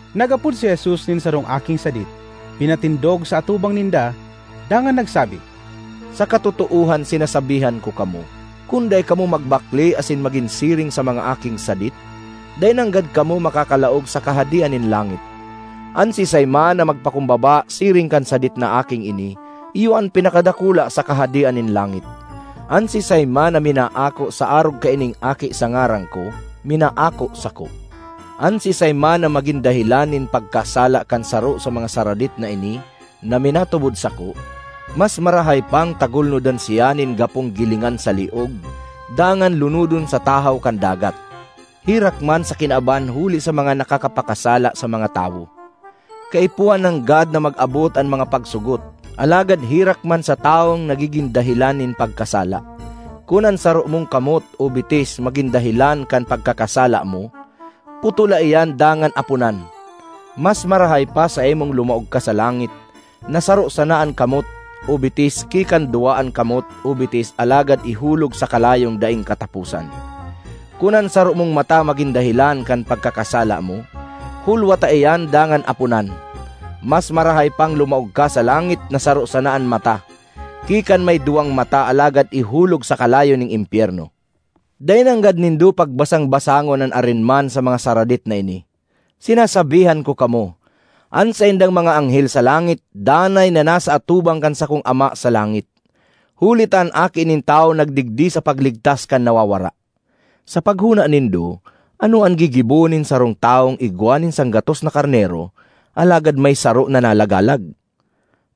Nag-apod si Jesus nin sarong aking sadit, pinatindog sa atubang ninda, dangan nagsabi, “Sa katotoohan sinasabihan ko kamo, kun dai kamo magbakle asin magin siring sa mga aking sadit, dai nanggad kamo makakalaog sa Kahadean nin langit. An siisay man na magpakumbaba siring kan sadit na aking ini, iyo an pinakadakula sa Kahadean nin langit. An siisay man na minaako sa arog kaining aki sa ngaran ko, minaako sako. ”An siisay man na magin dahelan nin pagkasala kan saro sa mga saradit na ini na minatubod sako, mas marahay pang tagulnodan siya nin gapong gilingan sa liog dangan lunodon sa tahaw kan dagat. Herak man sa kinaban huli sa mga nakakapakasala sa mga tawo! Kaipuhan nanggad na mag-abot an mga pagsugot, alagad herak man sa tawong nagigin dahelan nin pagkasala! ”Kun an saro mong kamot o bitis magin dahelan kan pagkakasala mo, putola iyan dangan aponan! Mas marahay pa saimong lumaog ka sa langit na saro sana an kamot o bitis ki kan duwa an kamot o bitis alagad ihulog sa kalayong daing kataposan. Kun an saro mong mata magin dahelan kan pagkakasala mo, hulwata iyan dangan aponan! Mas marahay pang lumaog ka sa langit na saro sana an mata ki kan may duwang mata alagad ihulog sa kalayo nin impyerno. ”Dai nanggad nindo pagbasang-basangon an arin man sa mga saradit na ini. Sinasabihan ko kamo, an saindang mga anghel sa langit danay na nasa atubang kan sakong Ama sa langit. (Huli ta an Aki nin Tawo nagdigdi sa pagligtas kan nawawara.) ”Sa paghona nindo, ano an gigibohon nin sarong tawong igwa nin sanggatos na karnero alagad may saro na nalagalag?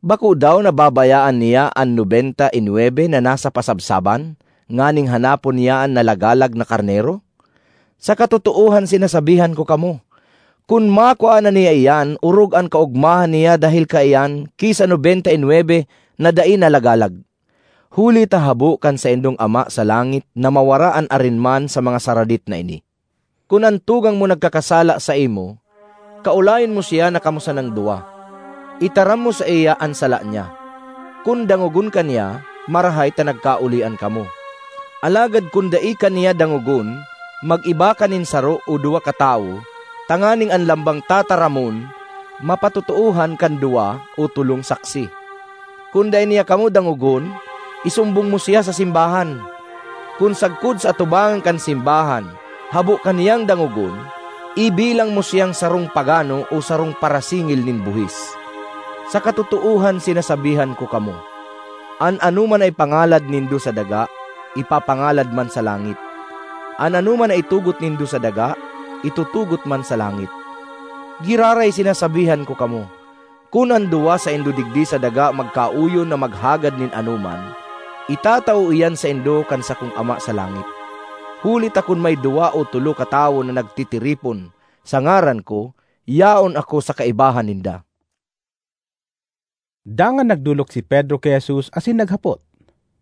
Bako daw na babayaan niya an nobenta y nwebe na nasa pasabsaban nganing hanapon niya an nalagalag na karnero? Sa katotoohan sinasabihan ko kamo, kun makua na niya iyan, orog an kaogmahan niya dahel kaiyan ki sa nobenta y nwebe na dai nalagalag. Huli ta habo kan saindong Ama sa langit na mawara an arin man sa mga saradit na ini. ”Kun an tugang mo nagkakasala saimo, kaolayon mo siya na kamo sanang duwa; itaram mo saiya an sala niya. Kun dangogon ka niya, marahay ta nagkaolian kamo. Alagad kun dai ka niya dangogon, mag-iba ka nin saro o duwa katawo tanganing an lambang tataramon mapatotoohan kan duwa o tolong saksi. Kun dai niya kamo dangogon, isumbong mo siya sa simbahan. Kun sagkod sa atubangan kan simbahan, habo ka niyang dangogon, ibilang mo siyang sarong pagano o sarong parasingil nin buhis. ”Sa katotoohan sinasabihan ko kamo, an anoman na ipangalad nindo sa daga, ipapangalad man sa langit; an anoman na itugot nindo sa daga, itutugot man sa langit. ”Giraray sinasabihan ko kamo, kun an duwa saindo digdi sa daga magkaoyon na maghagad nin anoman, itatao iyan saindo kan sakong Ama sa langit. Huli ta kun may duwa o tolo katawo na nagtitiripon sa ngaran ko yaon ako sa kaibahan ninda.” Dangan nagdolok si Pedro ki Jesus asin naghapot,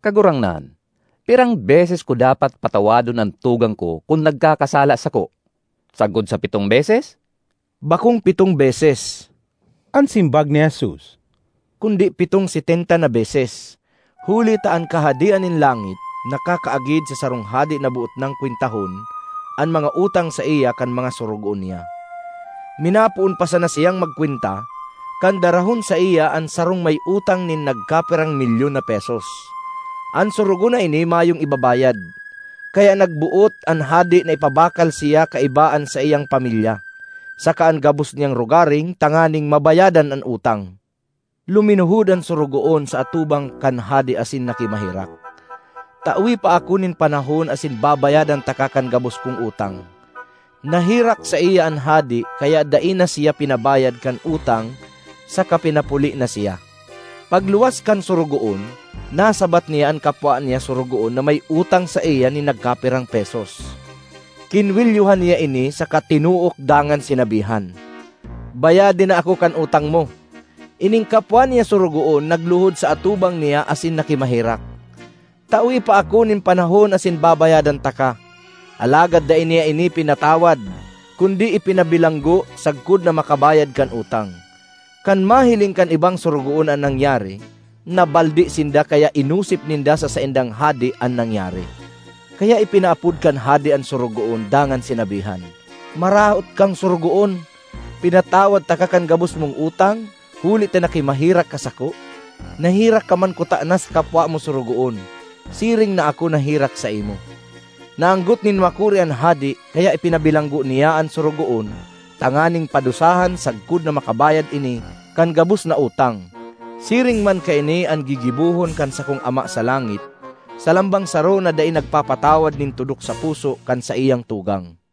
“Kagurangnan, pirang beses ko dapat patawadon an tugang ko kun nagkakasala sako? Sagkod sa pitong beses?” ”Bakong pitong beses,” an simbag ni Jesus, “kundi pitong setenta na beses. Huli ta an Kahadean nin langit nakakaagid sa sarong hade na boot nang kwentahon an mga utang saiya kan mga sorogoon niya. Minapoon pa sana siyang magkwenta, kan darahon saiya an sarong may utang nin nagkapirang milyon na pesos. An sorogoon na ini mayong ibabayad, kaya nagboot an hade na ipabakal siya kaiba an saiyang pamilya saka an gabos niyang rogaring tanganing mabayadan an utang. Luminuhod an sorogoon sa atubang kan hade asin nakimaherak, ‘Tawe pa ako nin panahon asin babayadan taka kan gabos kong utang.’ Naherak saiya an hade kaya dai na siya pinabayad kan utang saka pinapuli na siya. ”Pagluwas kan sorogoon, nasabat niya an kapwa niya sorogoon na may utang saiya nin nagkapirang pesos. Kinwelyohan niya ini saka tinook dangan sinabihan, ‘Bayade na ako kan utang mo!’ Ining kapwa niya sorogoon nagluhod sa atubang niya asin nakimaherak, ‘Tawe pa ako nin panahon asin babayadan taka!’ Alagad dai niya ini pinatawad kundi ipinabilanggo sagkod na makabayad kan utang. Kan mahiling kan ibang sorogoon an nangyari, nabaldi sinda kaya inosip ninda sa saindang hade an nangyari. Kaya ipinaapod kan hade an sorogoon dangan sinabihan, ‘Maraot kang sorogoon! Pinatawad taka kan gabos mong utang, huli ta nakimaherak ka sako. Naherak ka man kutana sa kapwa mo sorogoon, siring na ako naherak saimo.’ Naanggot nin makuri an hade, kaya ipinabilanggo niya an sorogoon tanganing padusahan sagkod na makabayad ini kan gabos na utang. ”Siring man kaini an gigibohon kan sakong Ama sa langit sa lambang saro na dai nagpapatawad nin tudok sa puso kan saiyang tugang.”